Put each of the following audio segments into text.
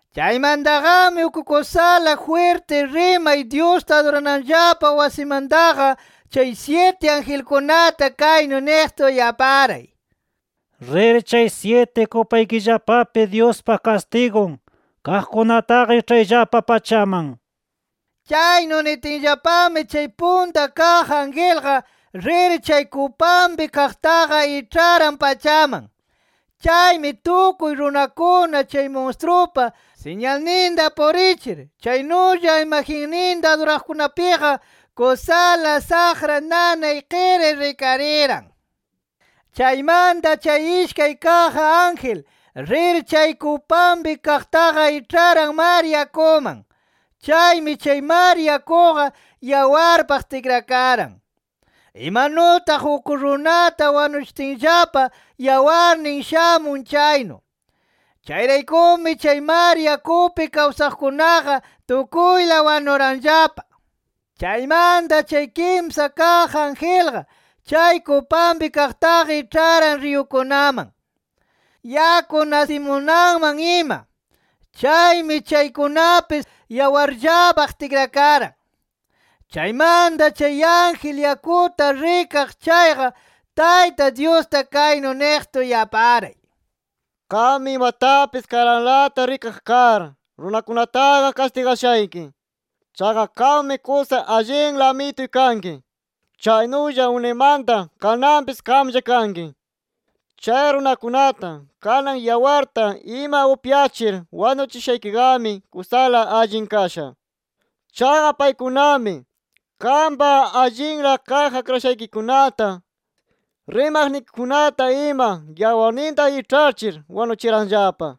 Chaymantaqami uk kusala jwirti rimay Dyusta adurananllapa wasimantaqa, chay syiti angelkunata kaynu niqta uyaparay: “Rir chay syiti kupaykillapapi Dyuspa kastigun kaqkunataqa iĉhayllapa pachaman” nir. Chaynu nitinllapami chay punta kaq angelqa, rir chay kupanpi kaqtaqa iĉharan pachaman. Chaymi tukuy runakuna chay munstrupa siñalninta purichir chaynulla imagenninta aduraqkunapiqa kusala saqra nanay qiri rikariran. Chaymanta chay ishkay kaq ángel, rir chay kupanpi kaqtaqa iĉharan mar yakuman. Chaymi chay mar yakuqa yawarpaq tikrakaran, imanutaq uk runata wanuchitinllapa yawarnin shamun chaynu. Chayraykumi chay mar yakupi kawsaqkunaqa tukuyla wanuranllapa. Chaymanta chay kimsa kaq angelqa, chay kupanpi kaqtaqa iĉharan riyukunaman, yaku nasimunanman ima. Chaymi chaykunapis yawarllapaq tikrakaran. Chaymanta chay ángel yakuta rikaq chayqa, Tayta Dyusta kaynu niqta uyaparay: “Qammi imatapis karanlata rikaq kar, runakunataqa kastigashayki. Chaqa qammi kusa allinla Amituy kanki. Chaynulla unaymanta, kananpis qamlla kanki. Chay runakunata kanan yawarta ima upyachir wanuchishaykiqami kusala allin kasha. Chaqa paykunami qampa allinla kaq akrashaykikunata, rimaqnikikunata ima yawarninta iĉhachir wanuchiranllapa” nir.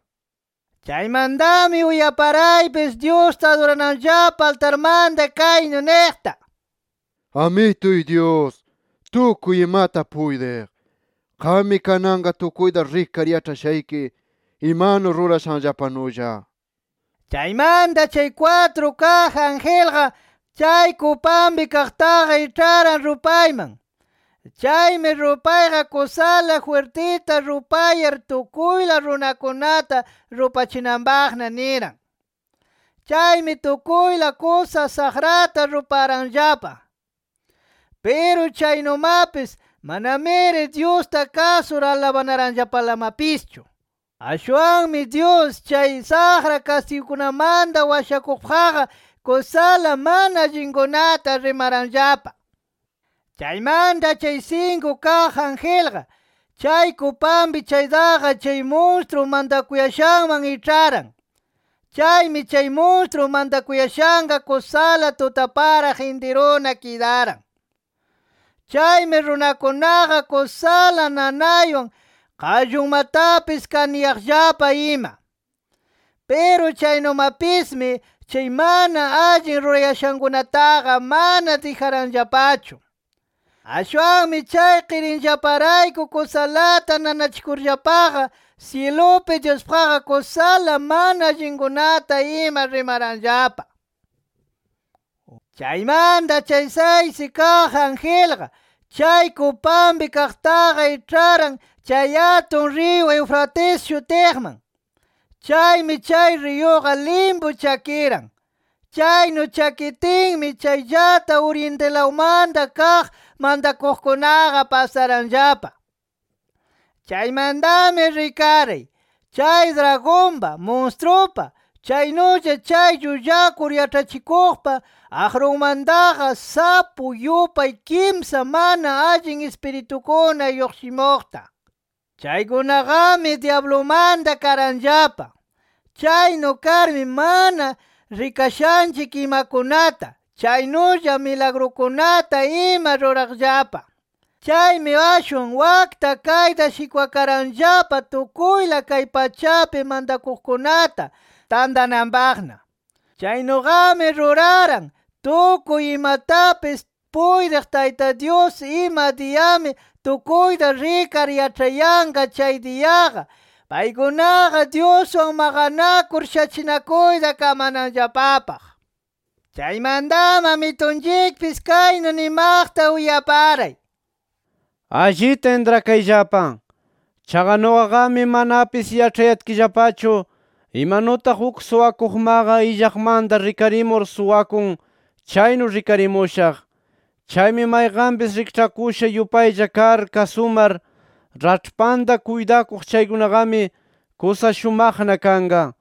Chaymantami uyaparaypis Dyusta adurananllapa altarmanta kaynu niqta: “Amituy Dyus, tukuy imata puytiq, Qammi kananqa tukuyta rikar yaĉhashayki imanu rurashanllapanulla” nir. Chaymanta chay kwatru kaq angelqa, chay kupanpi kaqtaqa iĉharan rupayman. Chaymi rupayqa kusala jwirtita rupayar tukuyla runakunata rupachinanpaqna niran. Chaymi tukuyla kusa saqrata ruparanllapa. Piru chaynumapis, manamiri Dyusta kasur alabanaranllapalamapischu. Ashwanmi Dyus chay saqra kastigukunamanta washakuqpaqqa, kusala mana allinkunata rimaranllapa. Chaymanta chay sinku kaq angelqa, chay kupanpi chaytaqa chay munstru mantakuyashanman iĉharan. Chaymi chay munstru mantakuyashanqa kusala tutaparaq intiruna kidaran. Chaymi runakunaqa, kusala nanaywan qallunmatapis kaniyaqllapa ima. Piru chaynumapismi, chay mana allin rurayashankunataqa mana dijaranllapachu. Ashwanmi chay qirinllaparayku kusalata nanachikurllapaqa, syilupi Dyuspaqqa kusala mana allinkunata ima rimaranllapa. Chaymanta chay saysi kaq angelqa, chay kupanpi kaqtaqa iĉharan chay atun riyu Eufrates shutiqman. Chaymi chay riyuqa limpu chakiran. Chaynu chakitinmi, chayllata orientilawmanta kaq mantakuqkunaqa pasaranllapa. Chaymantami rikaray, chay dragonpa, munstrupa, chaynulla chay llullakur yaĉhachikuqpa aqrunmantaqa, sapu yupay kimsa mana allin ispiritukuna lluqshimuqta. Chaykunaqami, dyablumanta karanllapa. Chaynu karmi mana rikashanchik imakunata, chaynulla milagrukunata ima ruraqllapa. Chaymi ashwan wakta kayta shikwakaranllapa tukuyla kay pachapi mantakuqkunata tantananpaqna. Chaynuqami ruraran, tukuy imatapis puytiq Tayta Dyus ima diyami tukuyta rikar yaĉhayanqa chay diyaqa, paykunaqa Dyuswan maqanakur shachinakuyta kamananllapapaq. Chaymantami Amitunchikpis kaynu nimaqta uyaparay: “Allita intrakayllapa. Chaqa nuqaqami manapis yaĉhayatkillapachu imanutaq uk suwakuqmaqa illaqmanta rikarimur suwakun, chaynu rikarimushaq. Chaymi mayqanpis rikĉhakusha yupaylla kar kasumar, raĉhpanta kuytakuq chaykunaqami, kusa shumaqna kanqa.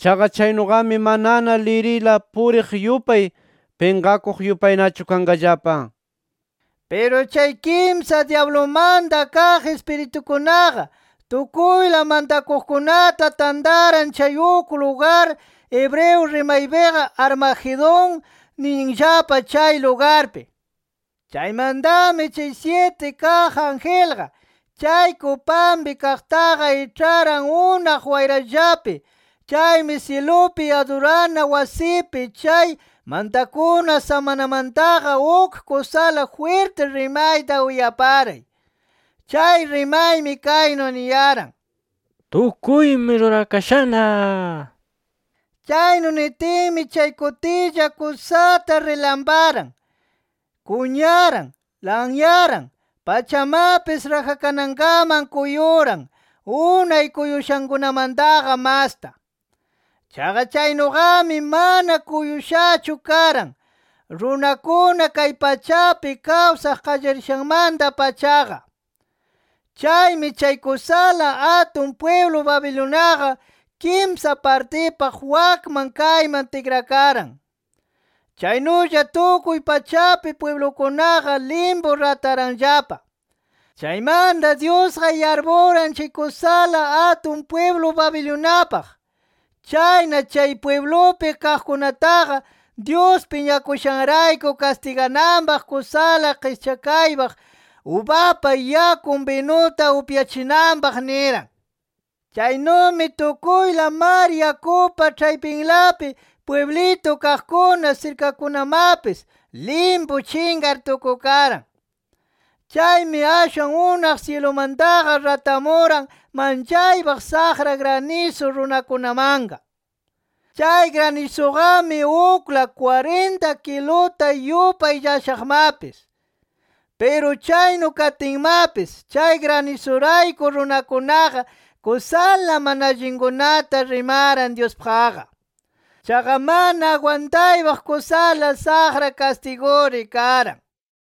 Chaqa chaynuqami manana lirila puriq yupay pinqakuq yupaynachu kanqallapa” nir. Piru chay kimsa dyablumanta kaq ispiritukunaqa, tukuyla mantakuqkunata tantaran chay uk lugar hebreo rimaypiqa Armagedón ninllapa chay lugarpi. Chaymantami chay syiti kaq angelqa, chay kupanpi kaqtaqa iĉharan unaq wayrallapi. Chaymi syilupi adurana wasipi chay mantakuna samanamantaqa uk kusala jwirti rimayta uyaray. Chay rimaymi kaynu niyaran: “¡Tukuymi rurakashana!” nir. Chaynu nitinmi chay kutilla kusata rilamparan, kunyaran, lanyaran, pachamapis rajakanankaman kuyuran unay kuyushankunamantaqa masta. Chaqa chaynuqami, mana kuyushachu karan, runakuna kay pachapi kawsaq qallarishanmanta-pachaqa. Chaymi chay kusala atun pwiblu Babiloniaqa, kimsa partipaq wakman kayman tikrakaran. Chaynulla tukuy pachapi pwiblukunaqa limpu rataranllapa. Chaymanta Dyusqa yarpuran chay kusala atun pwiblu Babiloniapaq. Chayna chay pwiblupi kaqkunataqa, Dyus piñakushanrayku, kastigananpaq kusala qischakaypaq ubapa yakun binuta upyachinanpaq niran. Chaynumi tukuyla mar yakupa ĉhaypinlapi pwiblitu kaqkuna, sirkakunamapis, limpu chinqar tukukaran. Chaymi ashwan unaq syilumantaqa ratamuran manchaypaq saqra granisu runakunamanqa. Chay granisuqami ukla, kwarinta kiluta yupay llashaqmapis. Piru chaynu katinmapis, chay granisurayku runakunaqa, kusala mana allinkunata rimaran Dyuspaqqa. Chaqa mana agwantaypaq kusala saqra kastiguri karan.